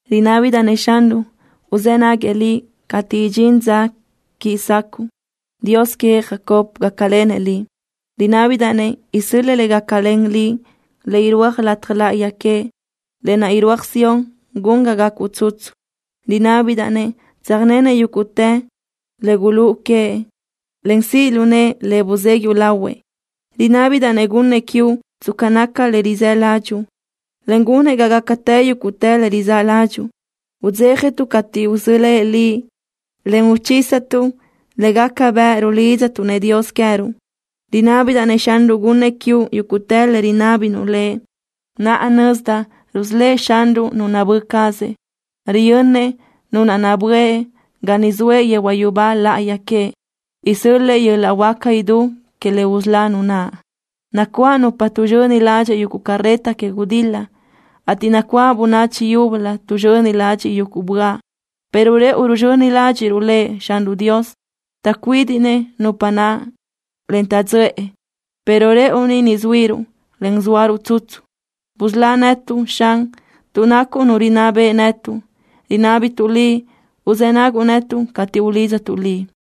Rinábidaʼ-nëʼ Xanruʼ uzë́ naguëʼ liʼ cateʼ idxín dza quiʼi sacuʼu. Dios queëʼ Jacob gácalenëʼ liʼ. Rinábidaʼ-nëʼ isö́l-lëʼë le gácalen liʼ le irúaj lataj láʼayi queëʼ. Lë naʼ irúaj Sión gun ga gacuʼ tsutsu. Rinábidaʼ-nëʼ tsöjnenëʼ yúguʼtë le gulúʼu queëʼ, en siʼ lu nëʼë le buzéguiʼu lahuëʼ. Rinábidaʼ-nëʼ gunnëʼ quiuʼ tsca naca le rizë́ ládxuʼu, en gunëʼ ga gácatë yúguʼtë le rizáʼ ládxuʼu. Udzéjatuʼ cateʼ usölë́ʼ liʼ, en uchísatuʼ le gaca bëʼ rulidztuʼ-nëʼ Dios queë́ruʼ. Rinábidaʼ-nëʼ Xanruʼ gunnëʼ quiuʼ yúguʼtë le rinábinuʼ Lëʼ. Naʼa nözdaʼ rusölë́ʼ Xanruʼ nu nabö́ cazëʼ. Riyönnëʼ nu naʼ nabö́ëʼ ga niʼ zoëʼ yehuaʼ yubá laʼayi queëʼ. Isö́l-lëʼë yöl-laʼ huáca idú queëʼ le usölá nu naʼ. Nacuáʼ nupa tuʼzxöni ladxiʼ yuguʼ carreta que gudil-la, ateʼ nacuáʼ bönachi yúbölö tuʼzxöni ladxiʼ yuguʼ böaʼ, pero rëʼu ruzxöni ládxiʼruʼ Lëʼ Xanruʼ Dios. Taʼcuídiʼnëʼ nupa naʼ, en taʼdzöʼë, pero rëʼu ni zuíruʼ, en zóaruʼ tsutsu. Busölá netuʼ, Xan, tuʼ nacuʼ Nu rinná beʼe netuʼ. Rinábituʼ Liʼ uzë́ naguʼ netuʼ cateʼ ulídzatuʼ Liʼ.